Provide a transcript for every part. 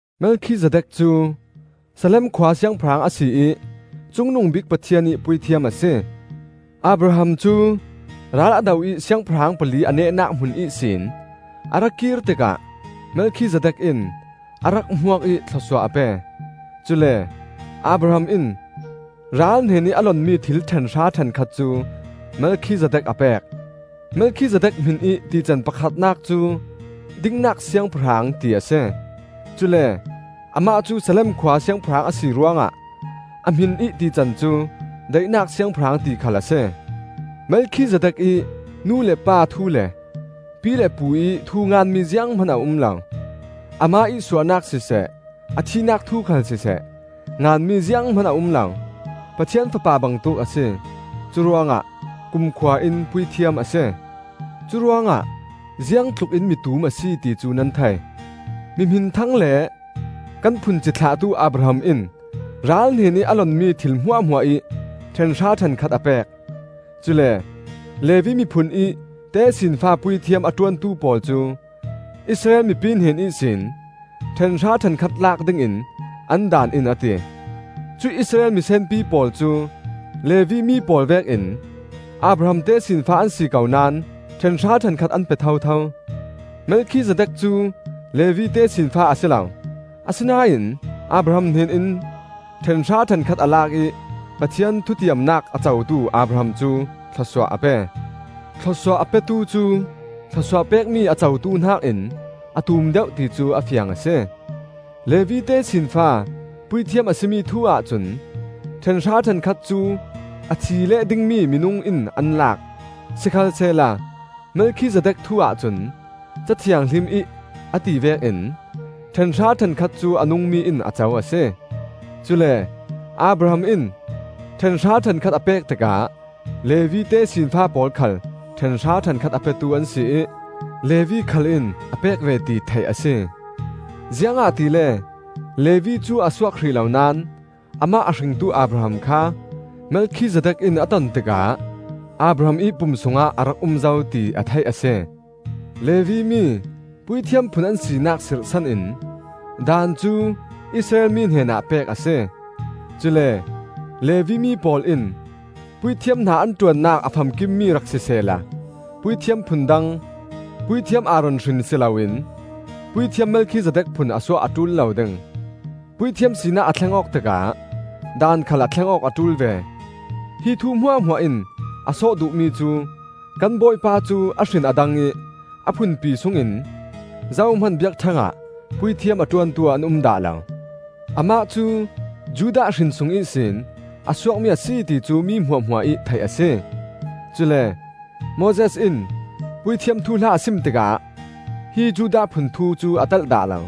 Melkhizedek cu Salem khua siangpahrang a si ih Cungnungbik Pathian ih puithiam a si. Abraham cu ral a do ih siangpahrang pali a nehnak hmun ihsin a ra kir tikah Melkhizedek in a rak hmuak ih thlawsuah a pe. Cule Abraham in ral hnenih a lonmi thil ṭhenhra ṭhenkhat cu Melkhizedek a pek. (Melkhizedek hminih tican pakhatnak cu “Dingnak Siangpahrang,” ti a si; cule amah cu Salem khua siangpahrang a si ruangah a hminih tican cu “Daihnak Siangpahrang,” ti khal a si.) Melkhizedek ih nu le pa thu le pi le pu ih thu nganmi zianghman a um lo. Amah ih suahnak siseh, a thihnak thu khal siseh, nganmi zianghman a um lo. Pathian Fapa bangtuk a si; curuangah kumkhua in puithiam a si. Curuangah ziangtlukin mi tum a si, ti cu nan thei. Mi hminthang le kan phun cithlahtu Abraham in ral hnenih a lonmi thil hmuahhmuah ih ṭhenhra ṭhenkhat a pek. Cule Levi miphun ih tesinfa puithiam a ṭuantu pawl cu Israel mipi hnen ihsin ṭhenhra ṭhenkhat lak dingin an Daan in a ti. Cuih Israel misenpi pawl cu Levi mi pawl vekin Abraham tesinfa an si ko naón ṭhenhra ṭhenkhat an pe thotho. Melkhizedek cu Levi tesinfa a si lo; asinain Abraham hnenin ṭhenhra ṭhenkhat a lak ih Pathian thutiamnak a cotu Abraham cu thlawsuah a pe. Thlawsuah a petu cu thlawsuah pekmi a cotu hnakin a tum deuh ti cu a fiang a si. Levi tesinfa puithiam a si mi thu-ah cun, ṭhenhra ṭhenkhat cu a thi leh dingmi minung in an lak; sikhalsehla Melkhizedek thu-ah cun, Ca Thianghlim ih a ti vekin, ṭhenhra ṭhenkhat cu a nungmi in a co a si. Cule Abraham in ṭhenhra ṭhenkhat a pek tikah (Levi tesinfa pawl khal ṭhenhra ṭhenkhat a petu an si ih) Levi khal in a pek ve ti theih a si. Ziangahtile Levi cu a suak hrih lo naón amah a hringtu Abraham kha Melkhizedek in a ton tikah Abraham ih pum sungah a rak um zo, ti a theih a si. Levi mi puithiam phun an sinak sirhsan in Daan cu Israel mi hnenah pek a si. Cule Levi mi pawl in puithiam hna an ṭuannak a famkimmi rak sisehla puithiam phun dang, puithiam Aaron hrin si loin puithiam Melkhizedek phun a suah a ṭul lo ding. Puithiam sinak a thleng awk tikah daan khal a thleng awk a ṭul ve. Hi thu hmuahhmuah in a sawh duhmi cu kan Bawipa cu a hrin a dang ih a phunpi sungin zohman biakṭheng ah puithiam a ṭuantu an um dah lo. Amah cu Judah hrin sung ihsin a suakmi a si ti cu mi hmuahhmuah ih theih a si; cule Moses in puithiam thuhla a sim tikah hi Judah phun thu cu a telh dah lo.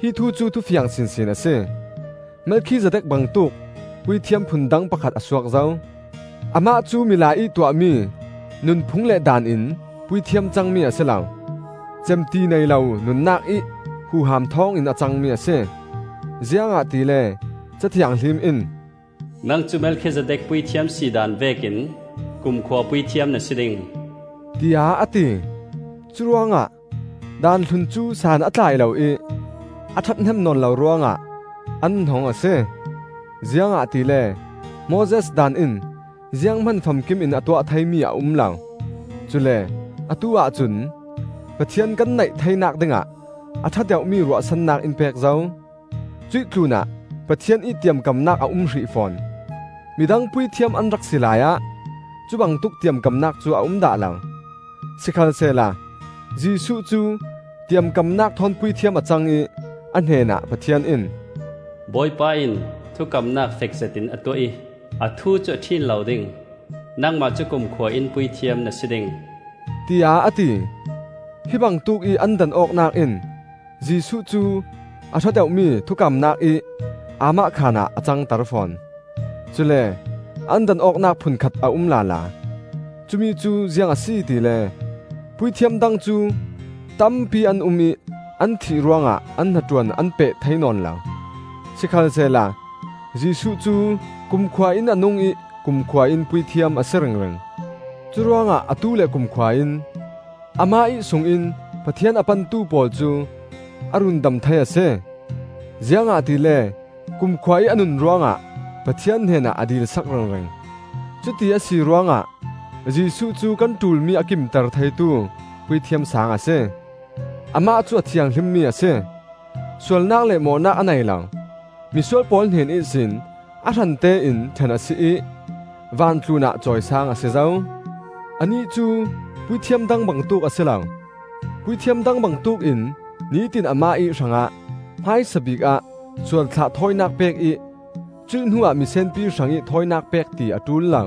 Hi thu cu thufiang sinsin a si; Melkhizedek bangtuk puithiam phun dang pakhat a suak zo. Amah cu milai ih tuahmi nunphung le daan in puithiam cangmi a si lo; cemti nei lo nunnak ih huham thawngin a cangmi a si. Ziangahtile Ca Thianghlim in, “Nang cu Melkhizedek puithiam si daan vekin kumkhua puithiam na si ding,” tiah a ti. Curuangah daan hlun cu san a tlai lo ih a ṭhathnem nawn lo ruangah an hnong a si. Ziangahtile Moses Daan in zianghman famkim in a tuah theimi a um lo; cule atu-ah cun Pathian kan naih theinak dingah a ṭha deuhmi ruahsannak in pek zo. Cuih tlunah Pathian ih tiamkamnak a um hrih fawn. Midang puithiam an rak si laiah cubangtuk tiamkamnak cu a um dah lo. Sikhalsehla Jesuh cu tiamkamnak thawn puithiam a cang ih a hnenah Pathian in, “Bawipa in thukamnak fek zetin a tuah ih a thu cu a ṭhin lo ding; ‘Nangmah cu kumkhua-in puithiam na si ding,’,” tiah a ti. Hi bangtuk ih an dan awknak in Jesuh cu a ṭha deuhmi thukamnak ih aamahkhan ah a cangter fawn. Cule an dan awknak phun khat a um lala: cumi cu ziang a si tile, puithiam dang cu tampi an um ih an thih ruangah an hnaṭuan an peh thei nawn lo. Sikhalsehla Jesuh cu kumkhua in a nung ih kumkhua in puithiam a si ringring. Curuangah atu le kumkhua in amah ih sungin Pathian a pantu pawl cu a rundam thei a si; ziangahtile kumkhua ih a nun ruangah Pathian hnenah a dil sak ringring. Cuti a si ruangah Jesuh cu kan ṭulmi a kimter theitu Puithiam Sang a si. Amah cu a thianghlimmi a si; sualnak le mawhnak a nei lo; misual pawl hnen ihsin a hrante in ṭhen a si ih van tlunah cawisang a si zo. Anih cu puithiam dang bangtuk a si lo; puithiam dang bangtuk in nitin amah ih hrangah hmaisabik ah sualthlah thawinak pek ih cuih hnuah misenpi hrangih thawinak pek ti a ṭul lo.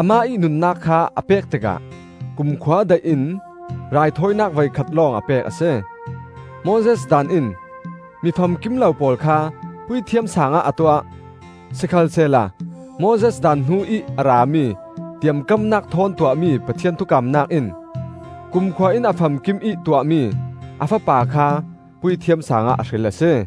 Amah ih nunnak kha a pek tikah kumkhua daih in raithawinak voikhat lawng a pek a si. Moses Daan in mi famkim lo pawl kha Puithiam Sangah a tuah. Sikhalsehla Moses daan hnu ih a rami tiamkamnak thawn tuahmi Pathian thukamnak in kumkhua in a famkimih tuahmi a Fapa kha Puithiam Sangah a hril a si.